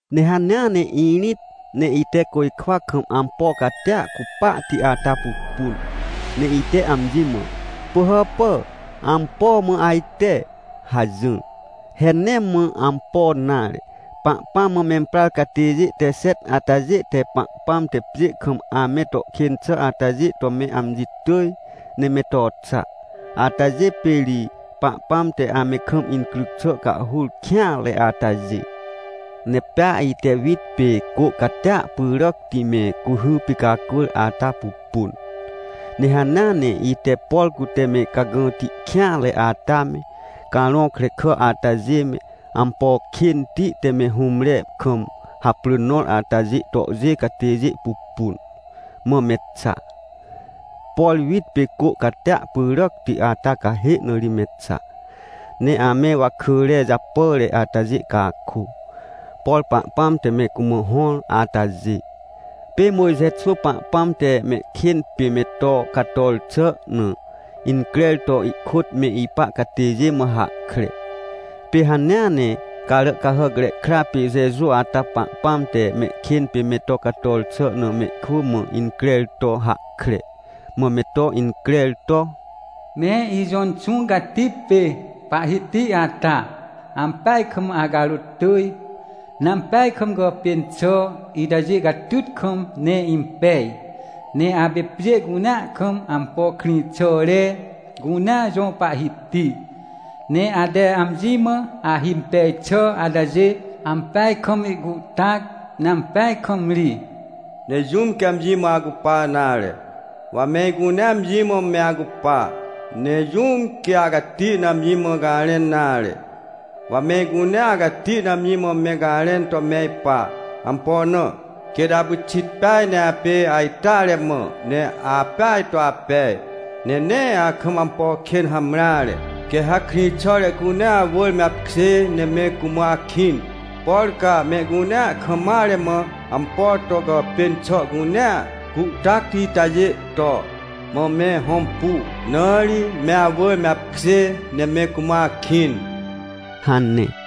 Ne hanea ne irĩt, ne ite côjkwa kam ampo catia cupahti ata pupun, ne ite amji mã: — Pỳhàpà ampo mã ajte? — hajỹr. He nee mã ampo nare, Pahpãm mã memprar catêjê te xet atajê te Pahpãm te pjê kam ame to kên xà atajê to me amji tỳj, ne me to xa. Atajê pê ri Pahpãm te ame kam incryc xà cahhur kêanre atajê. Ne pea ite wit pê cô catia pyràcti me cuhy picacwỳr ata pupun. Ne hanea ne ite, por cute me cagãti kêanre ata me, carõ krekà atajê me, ampo kênti te me hũmre kam haprỳ nõr atajê tohjê catêjê pupun, mã me xa. Por wit pê cô catia pyràcti ata cahê na ri me xa. Ne ame wakỳre japàre atajê cakô, por Pahpãm te me cumã hõr atajê. Pê Mojxe xwỳ Pahpãm te mehkên pê me to cator xà na increr to ihkôt me ipa catêjê mã hahkre. Pê hanea ne Caràcahàcre Kra pê Jeju ata Pahpãm te mehkên pê me to cator xà na mehkwỳ mã increr to hahkre. Mã me to increr to: “Me ijõ Inxũ Cati pê Pahhiti ata, ampeaj kam acarôt tỳj, ne ampeaj kam gàpên xà itajê catyt kam ne impej. Ne apê pjê cunea kam ampo krĩxàre cunea jõ Pahhiti, ne ate amji mã ahimpej xà atajê, ampeaj kam ihcuhtac, ne ampeaj kam ri! Ne jũm quê amji mã acupa nare? Wa me icunea amji mã me acupa. Ne jũm quê acati na amji mã garẽn nare? Wa me icunea acati na amji mã me garẽn to me ipa. Ampo na? Quêt apyxit peaj ne apê ajteare mã, ne apeaj to apej, ne nee akam ampo kên hamreare. Quê ha krĩxàre cunea awỳr me apkjê ne me cumã akĩn, por ca mehcunea kam mare mã ampo to gàpên xà cunea cuhtacti itajê to, mã me hõmpu, na ri me awỳr me apkjê ne me cumã akĩn” hane.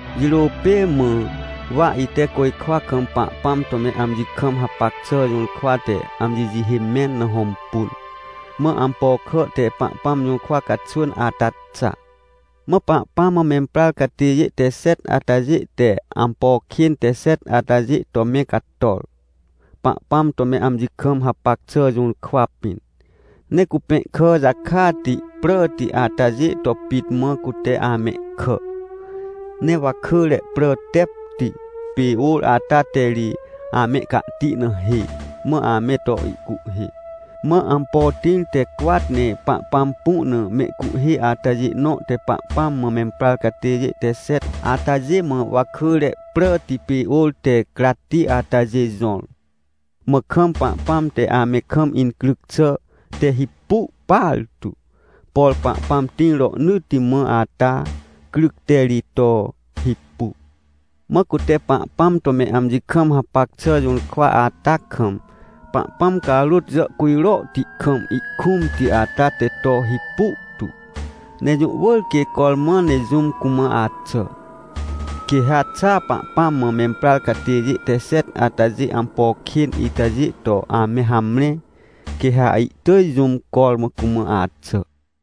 Jirô pê mã, wa ite côjkwa kam Pahpãm to me amji kam hapac xà jũrkwa te amji jihê mẽn na hõmpun, mã ampo kà te Pahpãm jũrkwa caxwỳn ata xa. Mã Pahpãm mã memprar catêjê te xet atajê te ampo kên te xet atajê to me cator, Pahpãm to me amji kam hapac xà jũrkwa pĩn. Ne cupẽhkà jakati pràti atajê to pit mã cute amehkà, ne wakỳre prà tepti pê ôr ata te ri amehcahti na hê, mã ame to ihcuhhê. Mã ampo tĩr te cwat ne Pahpãm pu na mehcuhhê atajê nõ te Pahpãm mã memprar catêjê te xet atajê mã wakỳre pràti pê ôr te cratti atajê jõr. Mã kam Pahpãm te ame kam incryc xà te hipu partu, por Pahpãm tĩr rohnỳtti mã ata cryc te ri to hipu. Mã cute Pahpãm to me amji kam hapac xà jũrkwa ata kam, Pahpãm carôt jàhcujrohti kam ihkũmti ata te to hipu tu, ne jũ wỳr quê cormã ne jũm cumã axà. Quê ha xa Pahpãm mã memprar catêjê te xet atajê ampo kên itajê to ame hamre, quê ha ihtỳj jũm cormã cumã axà.